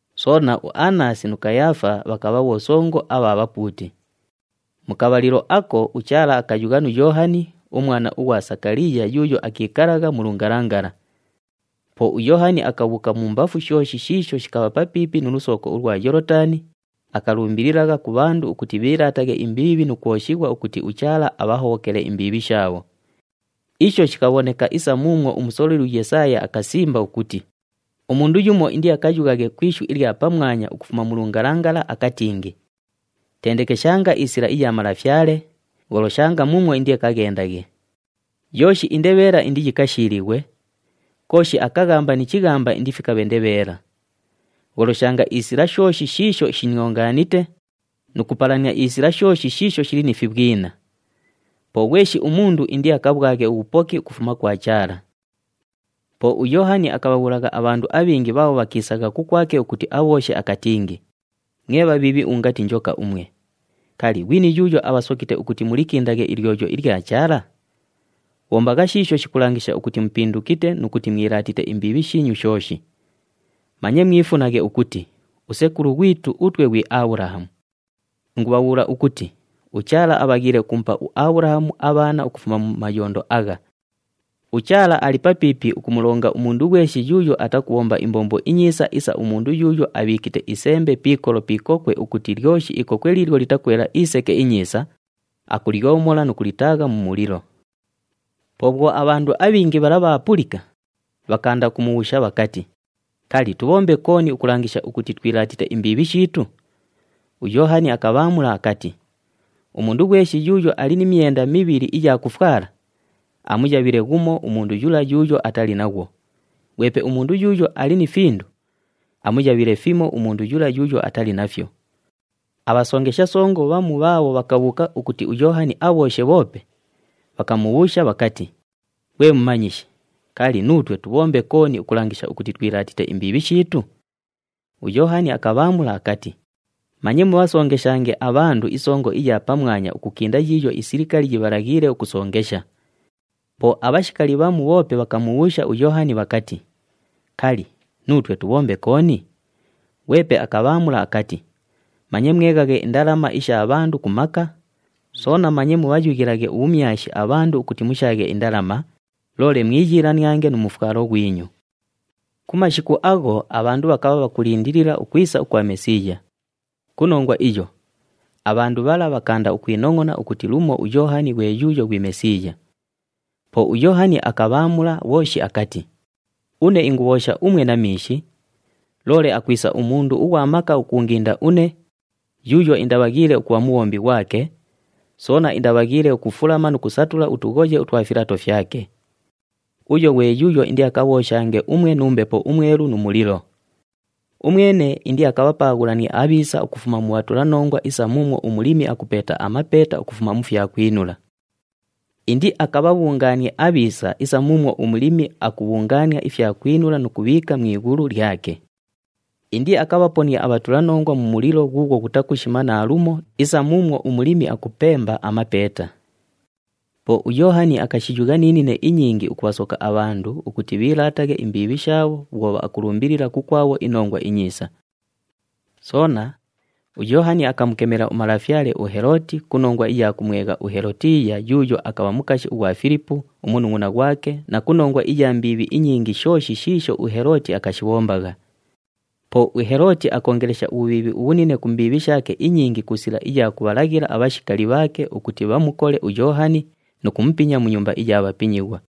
soona uAnasi nu Kayaafa bhakabha bhosongo abha bhapuuti. Mu kabhalilo ako, uChaala akayugha nu Yoohani, umwana ughwa Sakaliiya yuuyo akiikalagha mu lungalangala. Po uYoohani akabhuuka mumbafu shooshi shiisho shikabha papiipi nu lusooko ulwa Yoolotani, akalumbililagha ku bhandu ukuti bhiilaataghe imbiibhi nu kwoshighwa ukuti uChaala abhahobhokele imbiibhi shaabho. Isho shikabhoneka isa muumwo umusololi uYesaaya akasimba ukuti, “Umundu yumo indiakayughaghe ku ishu ilya pamwanya ukufuma mu lungalangala akatingi, ‘Tendekeshanga isila iya Malafyale, gholoshanga muumwo indiakaghendaghe. Yooshi indebheela indiyikashiilighwe, kooshi akaghamba ni chighamba indifikabhe ndebheela. Gholoshanga isila shooshi shiisho shiniongaanite, nu kupalania isila shooshi shiisho shili ni fibhwina. Po ghweshi umundu indiakabhwaghe ubhupoki ukufuma kwa Chaala.’” Po uYoohani akabhabhuulagha abhandu abhingi bhaabho bhakiisagha kukwake ukuti abhooshe, akatingi, “Mwe bhabhiibhi ungati njoka umwe! Kali, ghwini yuuyo abhasokite ukuti mulikindaghe ilyoyo ilya Chaala? Bhombagha shiisho shikulangisha ukuti mupindukite nu kuti mwilaatite imbiibhi shiinyu shooshi. Manye mwifunaghe ukuti, ‘Usekulu ghwitu utwe ghwi Abhulahamu.’ Ingubhabhuula ukuti uChaala abhaghiile ukumupa uAbhulahamu abhaana ukufuma mu mayondo agha! UChaala ali papiipi ukumulonga umundu ghweshi yuuyo atakubhomba imbombo inyiisa isa umundu yuuyo abhiikite isembe pi ikolo pi ikokwe, ukuti lyoshi ikokwe liilyo litakwela iseke inyiisa, akulyomola nu kulitaagha mu mulilo.” Po bhwo abhandu abhingi bhala bhaapulika, bhakaanda ukumubhuusha bhakati, “Kali, tubhombe kooni ukulangisha ukuti twilaatite imbiibhi shiitu?” UYoohani akabhaamula akati, “Umundu ghweshi yuuyo ali ni myenda mibhili iya kufwala, amuyabhile ghumo umundu yula yuuyo atali naghwo, ghwepe umundu yuuyo ali ni findu, amuyabhile fimo umundu yula yuuyo atali nafyo.” Abhasongesha songo bhamu bhaabho bhakabhuuka ukuti uYoohani abhooshe bhoope, bhakamubhuusha bhakati, “Ghwe Mumanyishi, kali, nuutwe tubhombe kooni ukulangisha ukuti twilaatite imbiibhi shiitu?” UYoohani akabhaamula akati, “Manye mubhasongeshange abhandu isongo iya pamwanya ukukinda yiiyo isilikali yibhalaghiile ukusongesha.” Po abhashikali bhamu bhoope bhakamubhuusha uYoohani bhakati, “Kali, nuutwe tubhombe kooni?” Ghwepe akabhaamula akati, “Manye mweghaghe indalama isha bhandu ku maka, soona manye mubhayughilaghe ubhumyashi abhandu ukuti mushaaghe indalama, loole mwiyiilaniange nu mufwalo ghwinyu.” Ku mashiku agho abhandu bhakabha bhakulindilila ukwisa ukwa Mesiiya. Ku nongwa iyo, abhandu bhala bhakaanda ukwinongʼona ukuti lumo uYoohani ghwe yuuyo ghwi Mesiiya. Po uYoohani akabhaamula bhooshi akati, “Une ingubhoosha umwe na miishi, loole akwisa umundu ughwa maka ukuunginda une, yuuyo indabhaghiile ukubha mubhombi ghwake, soona indabhaghiile ukufulama nu kusatula utughoye utwa filato fyake. Uyo ghwe yuuyo indiakabhooshange umwe nu Mbepo uMwelu nu mulilo. Umwene indiakabhapaaghulanie abhiisa ukufuma mu bhatulanongwa isa muumwo umulimi akupeeta amapeeta ukufuma mu fyakwinula. Indiakabhabhungaanie abhiisa isa muumwo umulimi akubhungaania ifyakwinula nu kubhiika mu ighulu lyake. Indiakabhaponie abhatulanongwa mu mulilo ghuughwo ghutakushima naalumo isa muumwo umulimi akupemba amapeeta.” Po uYoohani akashiyugha ni nine inyingi ukubhasoka abhandu ukuti bhiilaataghe imbiibhi shaabho bhwo akulumbilila kukwabho iNongwa iNyiisa. Soona, uYoohani akamukemela umalafyale uHelooti ku nongwa iya kumwegha uHelotiiya yuuyo akabha mukashi ghwa Filipu, umunungʼuna ghwake na ku nongwa iya mbiibhi inyingi shooshi shiisho uHelooti akashibhombagha. Po uHelooti akoongelesha ubhubhiibhi ubhunine ku mbiibhi shaake inyingi ku sila iya kubhalaghila abhashikali bhaake ukuti bhamukole uYoohani nu kumupinya mu nyumba iya bhapinyighwa.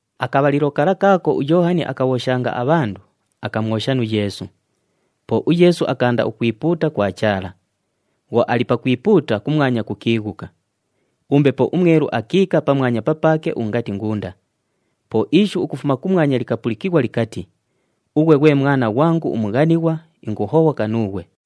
Akabhalilo kala kaako uYoohani akabhooshanga abhandu, akamwosha nu Yeesu. Po uYeesu akaanda ukwipuuta kwa Chaala. Bhwo ali pakwipuuta, kumwanya kukiighuka. UMbepo uMwelu akiika pamwanya papaake ungati ngunda. Po ishu ukufuma kumwanya likapulikighwa likati, “Ughwe ghwe Mwana ghwangu umughanighwa, inguhobhoka nuughwe.”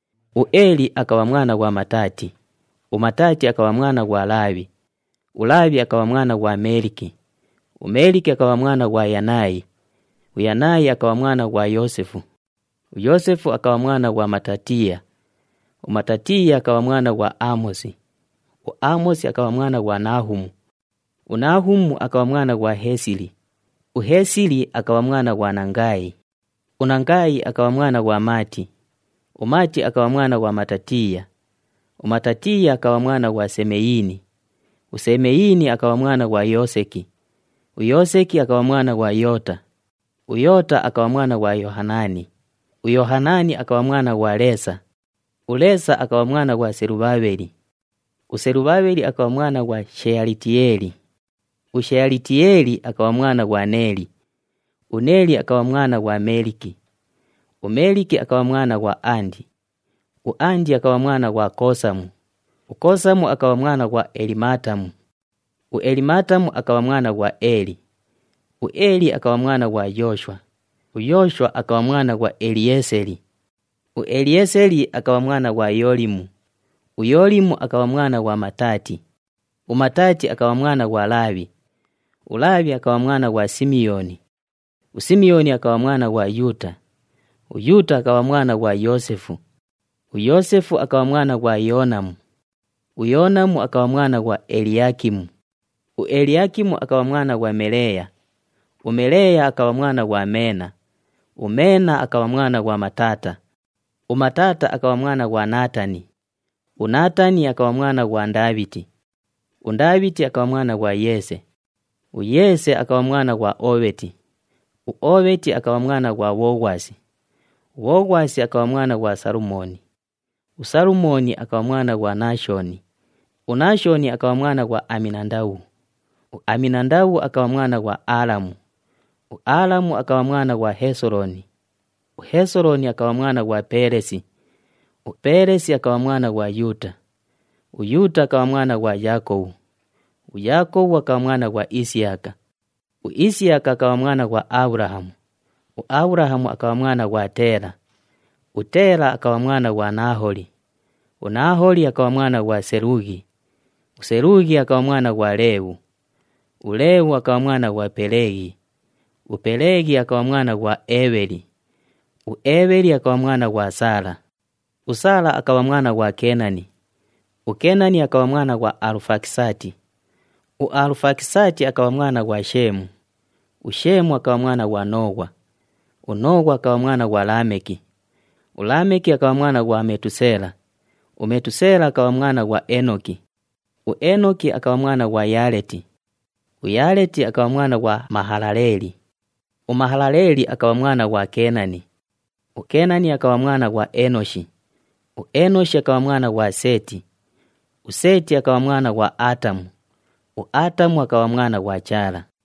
UEeli akabha mwana ghwa Mataati, uMataati akabha mwana ghwa Laabhi, uLaabhi akabha mwana ghwa Meeliki, uMeeliki akabha mwana ghwa Yanaayi, uYanaayi akabha mwana ghwa Yoosefu. UYoosefu akabha mwana ghwa Matatiiya, uMatatiiya akabha mwana ghwa Aamosi, uAamosi akabha mwana ghwa Nahuumu, uNahuumu akabha mwana ghwa Heesili, uHeesili akabha mwana ghwa Nangaayi. UNangaayi akabha mwana ghwa Maati, uMaati akabha mwana ghwa Matatiiya, uMatatiiya akabha mwana ghwa Semeyiini, uSemeyiini akabha mwana ghwa Yooseki, uYooseki akabha mwana ghwa Yoota. UYoota akabha mwana ghwa Yohanaani, uYohanaani akabha mwana ghwa Leesa, uLeesa akabha mwana ghwa Selubhabheli, uSelubhabheli akabha mwana ghwa Sheyalitiyeeli, uSheyalitiyeeli akabha mwana ghwa Neeli. UNeeli akabha mwana ghwa Meeliki, uMeeliki akabha mwana ghwa Andi, uAndi akabha mwana ghwa Koosamu, uKoosamu akabha mwana ghwa Elimaatamu, uElimaatamu akabha mwana ghwa Eeli. UEeli akabha mwana ghwa Yooshwa, uYooshwa akabha mwana ghwa Eliyeeseli, uEliyeeseli akabha mwana ghwa Yoolimu, uYoolimu akabha mwana ghwa Mataati, uMataati akabha mwana ghwa Laabhi. ULaabhi akabha mwana ghwa Simiyooni, uSimiyooni akabha mwana ghwa Yuuta, uYuuta akabha mwana ghwa Yoosefu, uYoosefu akabha mwana ghwa Yoonamu, uYoonamu akabha mwana ghwa Eliyaakimu. UEliyaakimu akabha mwana ghwa Meleeya, uMeleeya akabha mwana ghwa Meena, uMeena akabha mwana ghwa Mataata, uMataata akabha mwana ghwa Naatani, uNaatani akabha mwana ghwa Ndaabhiti. UNdaabhiti akabha mwana ghwa Yeese, uYeese akabha mwana ghwa Oobheti, uOobheti akabha mwana ghwa Bhoghwasi, uBhoghwasi akabha mwana ghwa Salumooni, uSalumooni akabha mwana ghwa Naashoni. UNaashoni akabha mwana ghwa Aminandabhu, uAminandabhu akabha mwana ghwa Aalamu, uAalamu akabha mwana ghwa Hesolooni, uHesolooni akabha mwana ghwa Peelesi, uPeelesi akabha mwana ghwa Yuuta. UYuuta akabha mwana ghwa Yaakobhu, uYaakobhu akabha mwana ghwa Isiyaka, uIsiyaka akabha mwana ghwa Abhulahamu, uAbhulahamu akabha mwana ghwa Teela, uTeela akabha mwana ghwa Nahooli. UNahooli akabha mwana ghwa Selughi, uSelughi akabha mwana ghwa Leebhu, uLeebhu akabha mwana ghwa Peleeghi, uPeleeghi akabha mwana ghwa Eebheli, uEebheli akabha mwana ghwa Saala. USaala akabha mwana ghwa Keenani, uKeenani akabha mwana ghwa Alufakisaati, uAlufakisaati akabha mwana ghwa Sheemu, uSheemu akabha mwana ghwa Nooghwa, uNooghwa akabha mwana ghwa Laameki. ULaameki akabha mwana ghwa Metuseela, uMetuseela akabha mwana ghwa Eenoki, uEenoki akabha mwana ghwa Yaleeti, uYaleeti akabha mwana ghwa Mahalaleeli, uMahalaleeli akabha mwana ghwa Keenani. UKeenani akabha mwana ghwa Eenoshi, uEenoshi akabha mwana ghwa Seeti, uSeeti akabha mwana ghwa Aatamu. UAatamu akabha mwana ghwa Chaala.